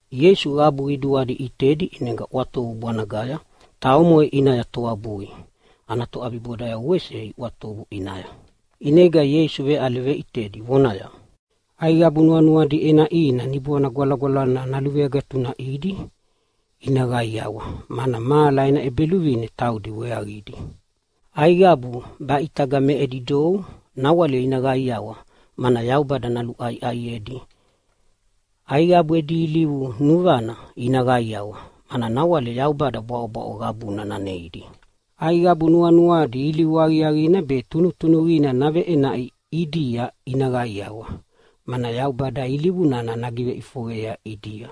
Ieisu qabu qiduadi ʼitedi, ʼinega ʼwatovu bwanagaya ta omoʼe ʼinaya toabui, ta ana toʼabibodayavo wese iʼwatovu ʼinaya. ʼInega Ieisu veʼale veʼitedi vonaya, “Aiqabu nuanuadi ʼenaʼina Niboana Gwalagwalana naluveagatunaʼidi ina qaiawa, mana mahala ena ʼEbeluvine taudi weaqidi. Aiqabu baʼitaga me edi dou nawale ina qaiawa, mana Yaubada naluʼaiʼaiedi. Aiqabu edi ilivu nuvana ina qaiawa, mana nawale Yaubada bwaʼobwaʼo qabuna naneidi. Aiqabu nuanuadi ilivu aqiaqina be tunutunuqina naveʼenaʼi ʼidia ina qaiawa, mana Yaubada ilivu nana nagiveʼifoqeyea ʼidia.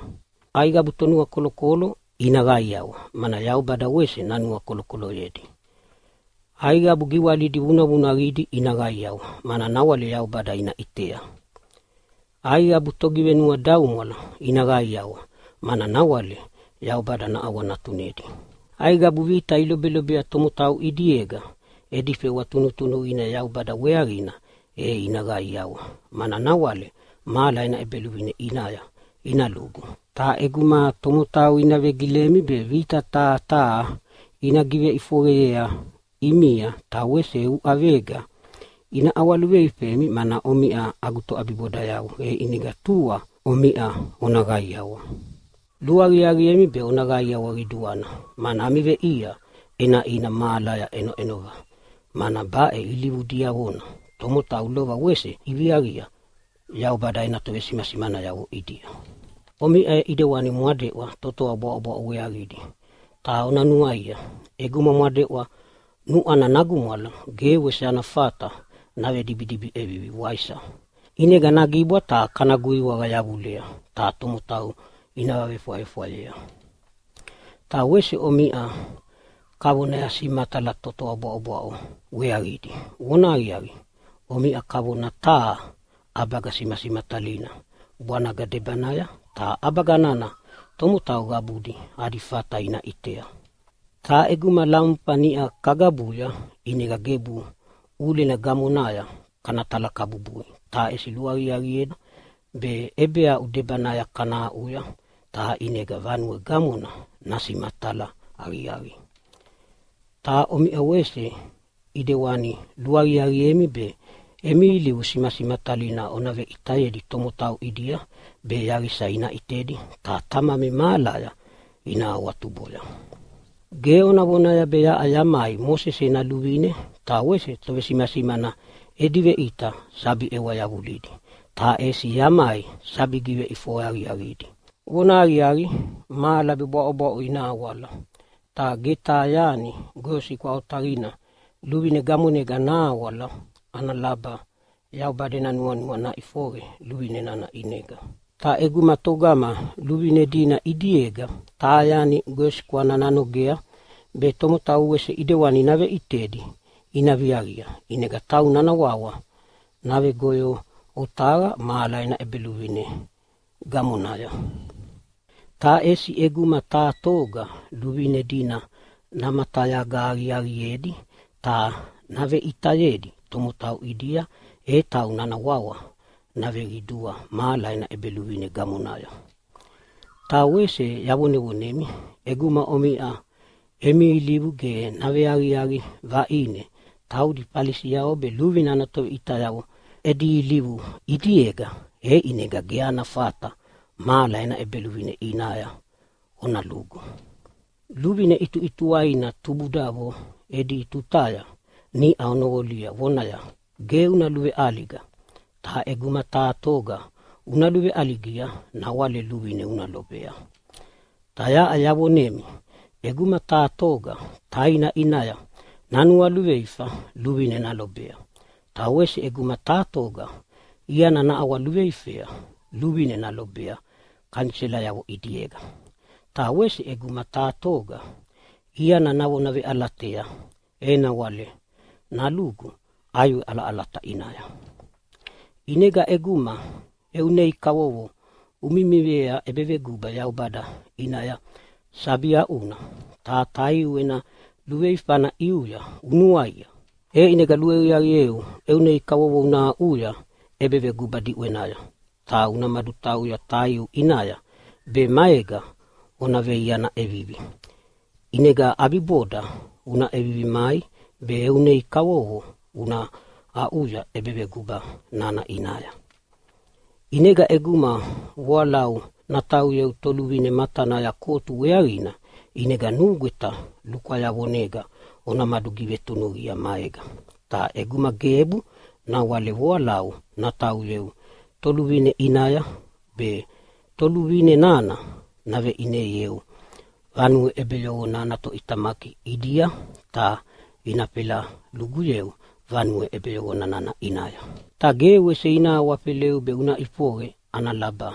Aiqabu tonuakolokolo ina qaiawa, mana Yaubada wese nanuakolokoloyedi. Aiqabu giwalidi vunavunaqidi ina qaiawa, mana nawale Yaubada ina ʼitea. Aiqabu togivenuadaumwala ina qaiawa, mana nawale Yaubada naʼawanatunedi. Aiqabu vita ilobelobea tomotau ʼidiega edi fewa tunutunuqina Yaubada weaqina e ina qaiawa, mana nawale mahala ena ʼEbeluvine ʼinaya ina lugu. “Ta ʼeguma tomotau ina vegilemi be vita taha taha ina giveʼifoqeyea ʼimia ta wese uʼavega ina ʼawaluveifemi mana omiʼa agu toʼabibodayavo, e ʼinega tua omiʼa ona qaiawa. Luaqiaqiemi be ona qaiawa qiduana, mana ami veʼia ʼenaʼina mahalaya ʼenoʼenova. Mana baʼe ilivu diavona tomotau lova wese iviaqia Yaubada ena tovesimasimanayavo ʼidia. “Omiʼa ʼidewani mwadeʼwa totoa bwaʼobwaʼo weaqidi. Ta ona nuaia, ʼeguma mwadeʼwa nuʼwana nagumwala ge wese ana fata navedibidibi ʼevivi, waisa? ʼInega nagibwa ta kana guiwaqa yavulea ta tomotau ina vavefwayefwayea. “Ta wese omiʼa kavonaya simatala totoa bwaʼobwaʼo weaqidi. Vonahaqiaqi, omiʼa kavona taha ʼabaga simasimatalina bwanaga debanaya, ta ʼabaga nana tomotau qabudi adi fata ina ʼitea. Ta ʼeguma lamufa niʼa kagabuya ʼinega gebu ʼulena gamonaya kana talakabubui, ta ʼesi luaqiaqiea be ʼebeaʼu debanaya kana aʼuya ta ʼinega vanue gamona nasimatala aqiaqiea. Ta omiʼa wese ʼidewanina luaqiaqiemi be emi ilivu simasimatalidi ona veʼitayedi tomotau ʼidia, be yaqisa ina ʼitedi ta Tamami mahalaya ina awatuboya. “Ge ona vonaya be yaʼa yamai Mosese ena luvine ta wese tovesimasimana edi veʼita sabi ʼewa yavulidi. Ta ʼesi yamai sabi giveʼifoqe aqiaqiedi. Vonahaqiaqi, mahala be bwaʼobwaʼo ina awala, ta ge taha yani goyosikwa otaqina luvine gamonega nahawala ana laba Yaubada ena nuanua naʼifoqe luvine nana ʼinega. Ta ʼeguma togama luvine dina ʼidiega taha yani goyosikwana nanogea be tomotau wese ʼidewani naveʼitedi ina viaqia, ʼinega tauna ana wawa navegoyo otaqa mahala ena ʼEbeluvine gamonaya. Ta ʼesi ʼeguma taha toga luvine dina namatayaga aqiaqiedi ta naveʼitayedi tomotau ʼidia, e tauna ana wawa naveqidua mahala ena ʼEbeluvine gamonaya. Ta wese yavonemi, ʼeguma omiʼa emi ilivu ge naveaqiaqi vaʼine taudi Falisiavo be luvine ana toveʼitayavo edi ilivu ʼidiega, e ʼinega ge ami fata mahala ena ʼEbeluvine ʼinaya ona lugu. “Luvine ʼituʼituwaina tubudavo edi tutaya niʼa onoqolia vonaya, ‘Ge una luveʼaliga. Ta ʼeguma taha toga una luveʼaligia nawale luvine una lobea.’ “Ta yaʼa yavonemi ʼeguma taha toga taina ʼinaya nanualuveifa luvine nalobea. Ta wese ʼeguma taha toga iana naʼawaluveifea luvine nalobea kaniselayavo ʼidiega. Ta wese ʼeguma taha toga iana navona veʼalatea, e nawale nalugu ʼaiwe ʼalaʼalata ʼinaya. ʼInega ʼeguma eu nei kavovo umimiea ʼebeveguba Yaubada ʼinaya sabi aʼuna, ta taiu ena luveifana ʼiuya unuaia, e ʼinega luaqiaqieu eu nei kavovo una aʼuya ʼebeveguba diʼwenaya ta una madutauya taiu ʼinaya be maega ona veiana ʼevivi. ʼInega ʼabiboda una ʼevivi mai be eu nei kavovo una aʼuya ʼebeveguba nana ʼinaya. “ʼInega ʼeguma voalau natauyeu toluvine matanaya kotu weaqina, ʼinega nugweta lukwayavonega ona madugivetunuqia maega. Ta ʼeguma gebu, nawale voalau natauyeu toluvine ʼinaya be toluvine nana naveʼineieu vanue ʼebeyoqona ana toʼitamaki ʼidia, ta ina fela luguyeu vanue nana ʼinaya. Ta ge wese ina awafeleu be una ʼifoqe ana laba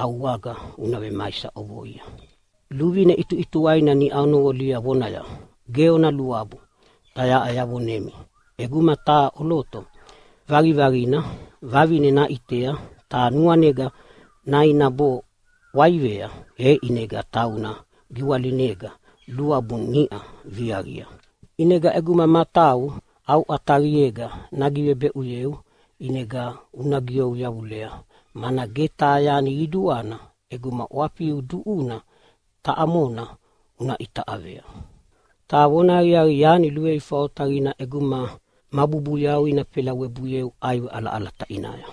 au aga una vemaisa ʼovoia. “Luvine ʼituʼituwaina niʼa onoqolia vonaya, ‘Ge ona luabu!’ Ta yaʼa yavonemi ʼeguma taha ʼoloto vaqivaqina vavine naʼitea ta nuanega nainabo ʼwaivea, e ʼinega tauna giwalinega luabu niʼa viaqia. ʼInega ʼeguma matau au ʼataqiega nagivebeʼuyeu, ʼinega una giou yavulea. Mana ge taha yani qiduana ʼeguma ʼwafiu duʼuna taʼa mona una ʼitaʼavea. Ta vonahaqiaqi, yani luveifa otaqina ʼeguma mabubuyau ina felawebuieu ʼaiwe ʼalaʼalata ʼinaya.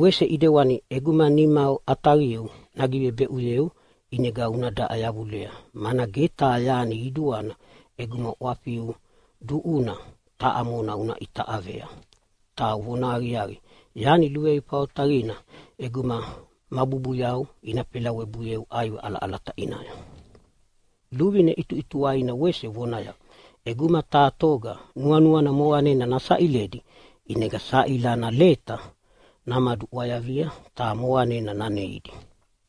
Wese ʼidewani ʼeguma nima ʼataqiu nagivebeʼuyeu, ʼinega una daʼa yavulea. Mana ge taha yani qiduana ʼeguma ʼwafiu duʼuna taʼa mona una ʼitaʼavea. Ta vonahaqiaqi, yani luveifa otaqina ʼeguma mabubuyau ina fela webuieu ʼaiwe ʼalaʼalata ʼinaya. “Luvine ʼituʼituwaina wese vonaya, ‘ʼEguma taha toga nuanuana moqanena nasaʼiledi, ʼinega saʼila ana leta namaduʼwayavia ta moqanena naneidi.’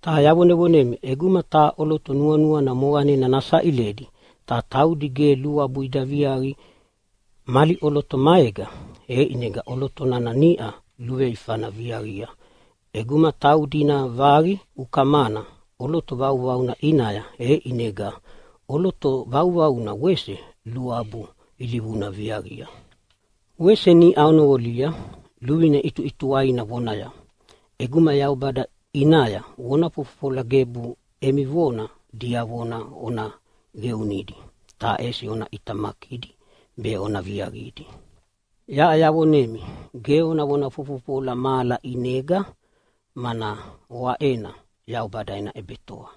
“Ta yavonemi, ʼeguma taha ʼoloto nuanuana moqanena nasaʼiledi ta taudi ge luabu ida viaqi mali ʼoloto maega, e ʼinega ʼoloto nana niʼa luveifana viaqia ʼeguma taudi ina vaqi ukamana ʼoloto vauvauna ʼinaya, e ʼinega ʼoloto vauvaunana wese luabu ilivuna viaviaqia. “Wese niʼa onoqolia luvine ʼituʼituwaina vonaya, ‘ʼEguma Yaubada ʼinaya ovona fofofola, gebu emi vona diavona ona qeunidi ta ʼesi ona ʼitamakidi be ona viaqidi.’ “Ta yaʼa yavonemi, ge ona vona fofofola mahala ʼinega, mana oaʼena Yaubada ena ʼebetoa.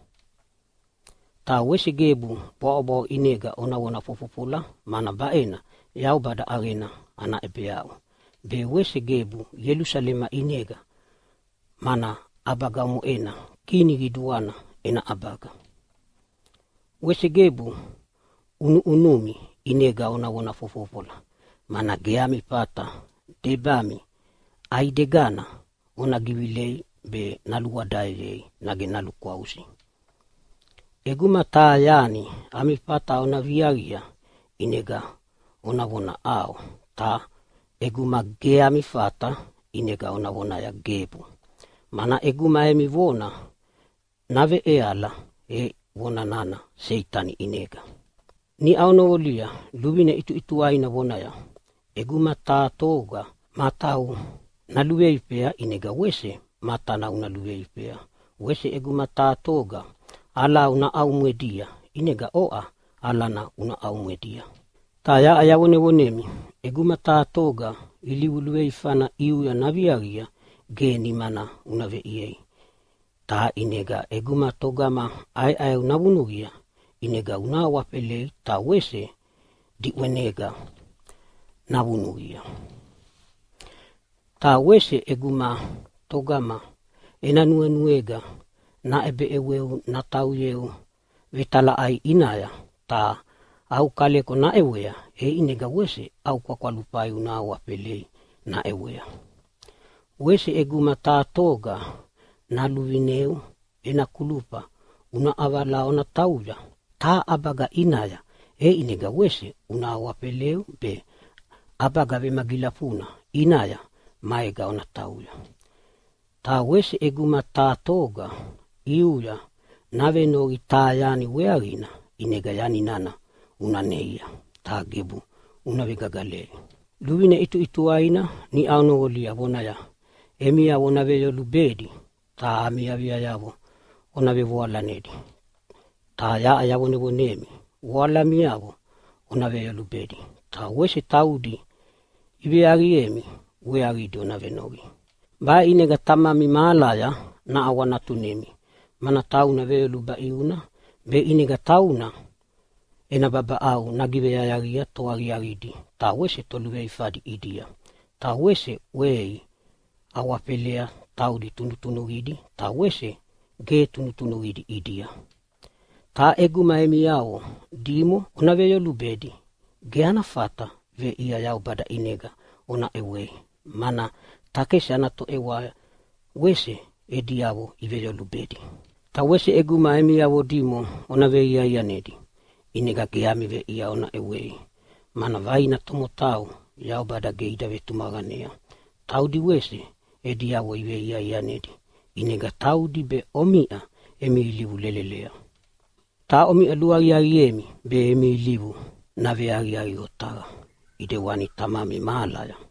Ta wese gebu bwaʼobwaʼo ʼinega ona vona fofofola, mana baʼena Yaubada ʼaqena ana ʼebeaʼu, be wese gebu Ielusalema ʼinega, mana ʼabaga omoʼena Kini qiduana ena ʼabaga. Wese gebu ʼunuʼunumi ʼinega ona vona fofofola, mana ge ami fata debami ʼaidegana ona givilei be naluʼwadaeyei nage nalukwausi. ʼEguma taha yani ami fata ona viaqia ʼinega ona vona ‘ʼAo’, ta ʼeguma ge ami fata ʼinega ona vona ‘Gebu’. Mana ʼeguma emi vona naveʼeala e vona nana Seitani ʼinega. “Niʼa onoqolia luvine ʼituʼituwaina vonaya, ‘ʼEguma taha toga matau naluveifea ʼinega wese matana una luveifea. Wese ʼeguma taha toga alau naʼaumwedia ʼinega oʼa alana una ʼaumwedia.’ “Ta yaʼa yavonevonemi, ʼeguma taha toga ilivu luveifana ʼiuya naviaqia ge nimana una veʼiei. Ta ʼinega ʼeguma togama ʼaeʼaeu navunuqia, ʼinega una awafelei ta wese diʼwenega navunuqia. Ta wese ʼeguma togama ena nuenuega naʼebeʼeweu natauyeu vetalaʼai ʼinaya ta au kaleko naʼewea, e ʼinega wese au kwakwalufai una awafelei naʼewea. Wese ʼeguma taha toga naluvineu ena kulufa una ʼavala ona tauya taha ʼabaga ʼinaya, e ʼinega wese una awafeleu be ʼabaga vemagilafuna ʼinaya maega ona tauya. Ta wese ʼeguma taha toga ʼiuya navenoqi taha yani weaqina ʼinega yani nana una neia, ta gebu una vegagalei. “Luvine ʼituʼituwaina niʼa onoqolia vonaya, ‘Emiavo ona veyolubedi, ta ami aviayavo ona vevoalanedi.’ “Ta yaʼa yavonemi voalamiavo ona veyolubedi, ta wese taudi iveaviemi weaqidi ona venoqi. Baʼe ʼinega Tamami mahalaya naʼawanatunemi, mana tauna veyoluba ʼiuna be ʼinega tauna ena babaʼau nagiveyayaqia toaqiaqidi ta wese toluveifadi ʼidia, ta wese ʼwei awafelea taudi tunutunuqidi ta wese ge tunutunuqidi ʼidia. Ta ʼeguma emiavo dimo ona veyolubedi ge ana fata veʼia Yaubada ʼinega ona ʼewei, mana takesi ana toʼewa wese ediavo iveyolubedi. Ta wese ʼeguma emiavo dimo ona veiaianedi, ʼinega ge ami veʼia ona ʼewei, mana vaina tomotau Yaubada ge ida vetumaqanea taudi wese ediavo iveiaianedi. ʼInega taudi be omiʼa emi ilivu lelelea. Ta omiʼa luaqiaqiemi be emi ilivu naveaqiaqi otaqa ʼidewani Tamami mahalaya.”